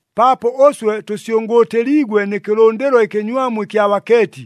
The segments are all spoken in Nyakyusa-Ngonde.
Paapo ʉswe tʉsyʉngʉʉtɨliigwe nɨ kɨlʉndɨlo ɨkɨnywamu ɨkya bakeeti,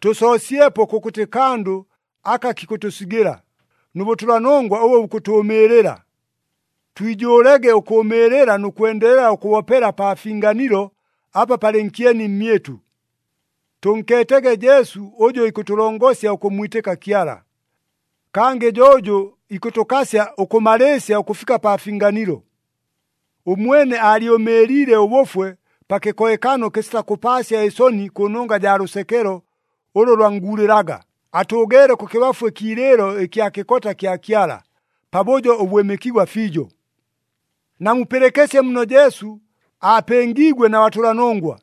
tʉsoosyepo kʉkʉtɨ kandʉ aka kikʉtʉsigɨla, nʉ bʉtʉlanongwa ʉbʉ bukʉtʉʉmɨɨlɨla. Twijʉʉlege ʉkʉʉmɨɨlɨla nʉ kwendelela ʉkʉbopela pa finganilo apa palɨ nkyeni mmyɨtʉ. Tʉnkeetege Jesu ʉjʉ ikʉtʉlongosya ʉkʉmmwitɨka Kyala. Kangɨ jo ʉjʉ ikʉtʉkasya ʉkʉmalɨɨsya ʉkʉfika pa finganilo. Ʉmwene aalyʉmɨɨliile ʉbʉfwe pa kɨkohekano kɨsita kʉpaasya ɨsoni kʉnongwa jaa lʉsekelo ʉlʉ lwannguulɨlaga, atʉʉgeele kʉkɨbafu ɨkiilɨɨlo ɨkya kɨkota kya Kyala, pabʉjo ʉbwɨmɨkigwa fiijo. Namupɨlɨkɨsye muno Jesu aapɨngiigwe na batʉlanongwa,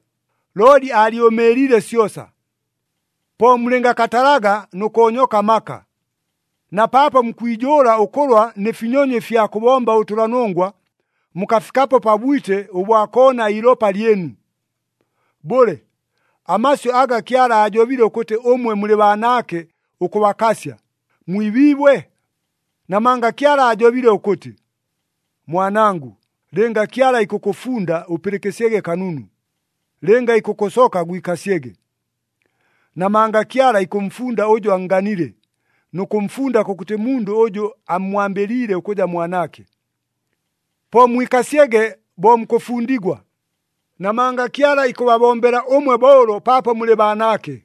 looli aalyʉmɨɨliile syosa. Po mulɨngakatalaga nʉ koonyoka amaka. Na paapo mukwijʉʉla ʉkʉlwa nɨ finyonyo ɨfya kʉbomba ʉbʉtʉlanongwa, mukafikapo pa bwite ʉbwa koona iilopa lyɨnu. Bʉle, amasyʉ aga Kyala aajobile ʉkʉtɨ ʉmwe mulɨ baanaake ʉkʉbakasya, mwibiibwe? Namanga Kyala aajobile ʉkʉtɨ, “Mwanangʉ, lɨnga Kyala ikʉkʉfunda, ʉpɨlɨkɨsyege kanunu. Lɨnga ikʉkʉsoka, gwikasyege. Namanga Kyala ikʉmfunda ʉjʉ annganile, nʉ kʉmfunda kʉkʉtɨ mundʉ ʉjʉ ammwambɨliile ʉkʉja mwanaake.” Po mwikasyege bo mukʉfundigwa, namanga Kyala ikʉbabombela ʉmwe bo ʉlo paapo mulɨ baanaake.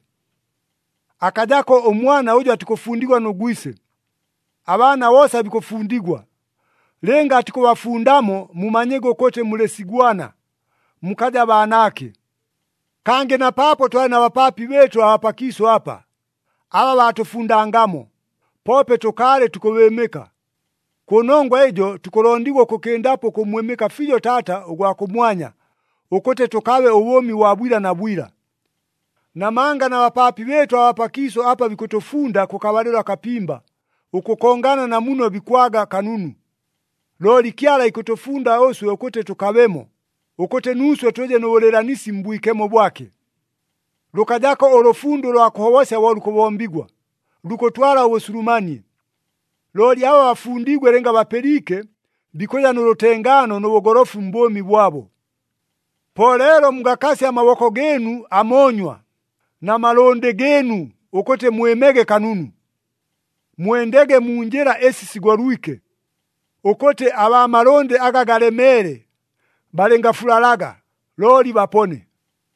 Akajako ʉmwana ʉjʉ atikʉfundigwa nʉ gwise. Abaana boosa bikʉfundigwa. Lɨnga atikʉbafundamo, mumanyege ʉkʉtɨ mulɨ sigwana, mukaja baanaake. Kangɨ na paapo twalɨ na bapaapi bɨɨtʉ abaa pakiisʉ apa, aba baatʉfundangamo, poope tʉkaalɨ tukʉbɨɨmɨka. Kʉnongwa ɨjo tukʉlondigwa ʉkʉkɨndapo ʉkʉmmwɨmɨka fiijo Taata ʉgwa kʉmwanya, ʉkʉtɨ tʉkabe ʉbʉʉmi bwa bwila na bwila. Namanga na bapaapi bɨɨtʉ abaa pakiisʉ apa bikʉtʉfunda kʉkabalɨlo akapimba, ʉkʉkongana na muno bikwaga kanunu. Looli Kyala ikʉtʉfunda ʉswe ʉkʉtɨ tʉkabemo, ʉkʉtɨ nuuswe tʉje nʉ bʉlɨɨlanisi mbwikemo bwake. Lʉkajako ʉlʉfundo ʉlwa kʉhobosya bo lukʉbombigwa, lukʉtwala ʉbʉsulumanie. Looli aba bafundiigwe lɨnga bapɨliike, bikʉja nʉ lʉtengaano nʉ bʉgolofu mbʉʉmi bwabo. Po leelo mugakasye amaboko gɨɨnu amoonywa na malʉndɨ gɨɨnu ʉkʉtɨ mwɨmege kanunu. “Mwendege mu njɨla ɨsi sigolwike,” ʉkʉtɨ abaa malʉndɨ aga galemeele balɨngafulalaga, looli bapone.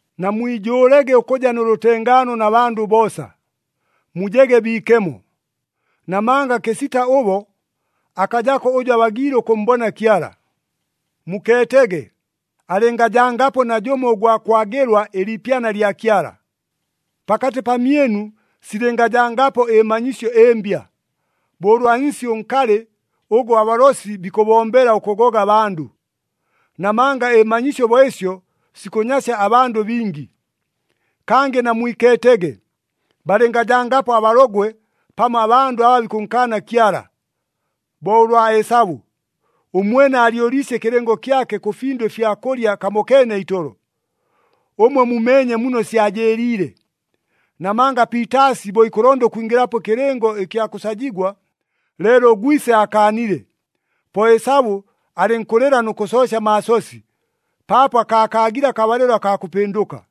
Namwijʉʉlege ʉkʉja nʉ lʉtengaano na bandʉ boosa, mujege biikemo. Namanga kɨsita ʉbo, akajako ʉjʉ abagiile ʉkʉmmbona Kyala. Mukeetege, alɨngajangapo najʉmo ʉgwa kwagɨlwa ɨliipyana lya Kyala. Pakatɨ pamyɨnu silɨngajangapo ɨmanyisyo ɨmbya, bo ʉlwa nsi ʉnkalɨ ʉgʉ abalosi bikʉbombela ʉkʉgoga abandʉ. Namanga ɨmanyisyo bo ɨsyo sikʉnyasya abandʉ bingi. Kangɨ namwikeetege, balɨngajangapo abalogwe pamo abandʉ aba bikʉnkaana Kyala, bo ʉlwa Esabu. Ʉmwene aalyʉliisye ɨkɨlɨngo kyake kʉ findʉ ɨfya kʉlya kamokeene itolo. Ʉmwe mumeenye muno syajɨɨliile, namanga piitaasi bo ikʉlonda ʉkwingɨlapo ɨkɨlɨngo ɨkya kʉsajigwa, leelo ʉgwise aakaanile. Po Esabu alɨnkʉlɨla nʉ kʉsoosya amaasosi, paapo akaakaagile akabalɨlo akaa kʉpɨndʉka.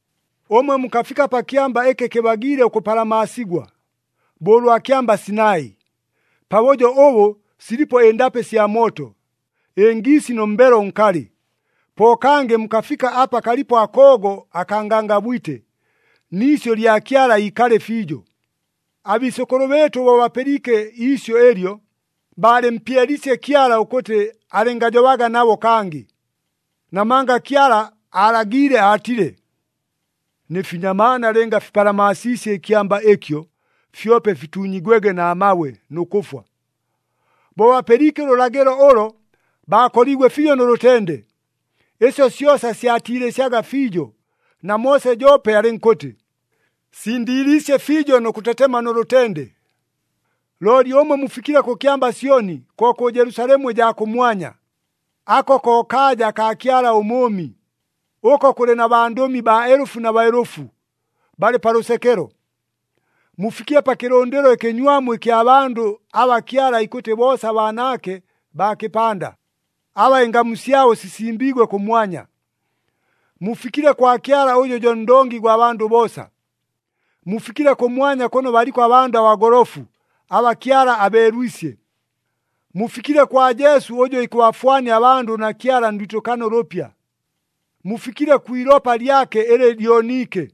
Ʉmwe mukafika pa kyamba ɨkɨ kɨbagiile ʉkʉpalamaasigwa, bo ʉlwa kyamba Sinai, pabʉjo ʉbʉ silipo ɨndapɨ sya mooto, ɨngiisi nʉ mbelo ʉnkalɨ. Po kangɨ mukafika apa kalipo akoogo akaa ngangabwite, ni isyʉ lya Kyala ikalɨ fiijo. Abiisʉkʉlʉ bɨɨtʉ bo bapɨliike iisyʉ ɨlyo, baalɨmpyeliisye Kyala ʉkʉtɨ alɨngajobaga nabo kangɨ. Namanga Kyala aalagiile aatile, “Nɨ finyamaana lɨnga fipalamaasiisye ɨkyamba ɨkyo, fyope fituunyigwege na mabwe nʉ kʉfwa.” Bo bapɨliike ʉlʉlagɨlo ʉlo, baakoliigwe fiijo nʉ lʉtende. Ɨsyo syosa syatiilɨsyaga fiijo, na Moose joope alɨnkʉtɨ, “Sindiiliisye fiijo nʉ kʉtetema nʉ lʉtende.” Looli ʉmwe mufikile kʉ kyamba Syoni, ko kʉ Jelusalemu ɨjaa kʉmwanya. Ako ko kaaja akaa Kyala ʉMʉʉmi. Ʉko kʉlɨ na bandʉmi baelʉfu na baelʉfu, balɨ pa lʉsekelo. Mufikile pa kɨlʉndɨlo ɨkɨnywamu ɨkya bandʉ aba Kyala ikʉtɨ boosa baanaake baa kɨpanda, aba ɨngamu syabo sisimbiigwe kʉmwanya. Mufikile kwa Kyala ʉjʉ jo ndongi gwa bandʉ boosa. Mufikile kʉmwanya kʉno baliko abandʉ abagolofu, aba Kyala abeelwisye. Mufikile kwa Jesu, ʉjʉ ikʉbafwania abandʉ na Kyala ndwitɨkano ʉlʉpya. Mufikile kwi ilopa lyake ɨlɨ lyoniike.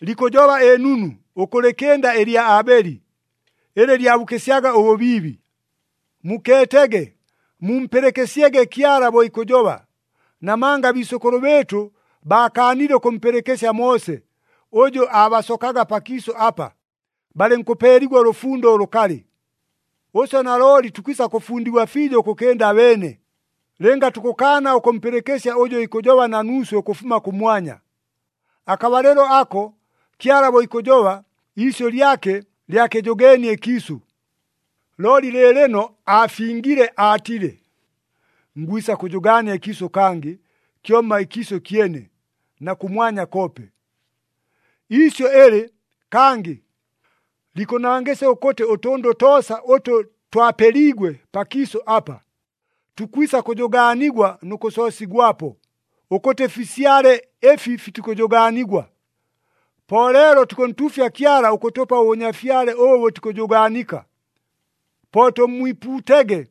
Likʉjoba ɨnunu, ʉkʉlɨkɨnda ɨlya Aabeli, ɨlɨ lyabukɨsyaga ʉbʉbiibi. Mukeetege, mumpɨlɨkɨsyege Kyala bo ikʉjoba. Namanga abiisʉkʉlʉ bɨɨtʉ baakaanile ʉkʉmpɨlɨkɨsya Moose, ʉjʉ aabasokaga pakiisʉ apa, balɨnkʉpeeligwa ʉlʉfundo ʉlʉkalɨ. Ʉswe nalooli tukwisa kʉfundigwa fiijo ʉkʉkɨnda abeene, lɨnga tukʉkaana ʉkʉmpɨlɨkɨsya ʉjʉ ikʉjoba na nuuswe ʉkʉfuma kʉmwanya. Akabalɨlo ako, Kyala bo ikʉjoba, iisyʉ lyake lyakɨjʉgeenie ɨkiisʉ. Looli lɨɨlɨno aafingile aatile, “Ngwisa kʉjʉgaania ɨkiisʉ kangɨ, kyomma ɨkiisʉ kyene, na kʉmwanya koope.” Iisyʉ ɨlɨ, “Kangɨ,” likʉnangɨsya ʉkʉtɨ ʉtʉndʉ toosa ʉtʉ twapeliigwe pakiisʉ apa, tukwisa kʉjʉgaanigwa nʉ kʉsoosigwapo, ʉkʉtɨ fisyale ɨfi fitikʉjʉgaanigwa. Po leelo tukʉntuufya Kyala ʉkʉtʉpa ʉbʉnyafyale ʉbʉ bʉtikʉjʉgaanika. Po tʉmmwipuutege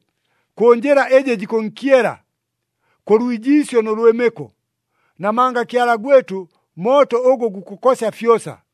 kʉ njɨla ɨjɨ jikʉnkyela, kʉ lwijiisyo nʉ lwɨmɨko. Namanga Kyala gwɨtʉ, mooto ʉgʉ gukʉkosya fyosa.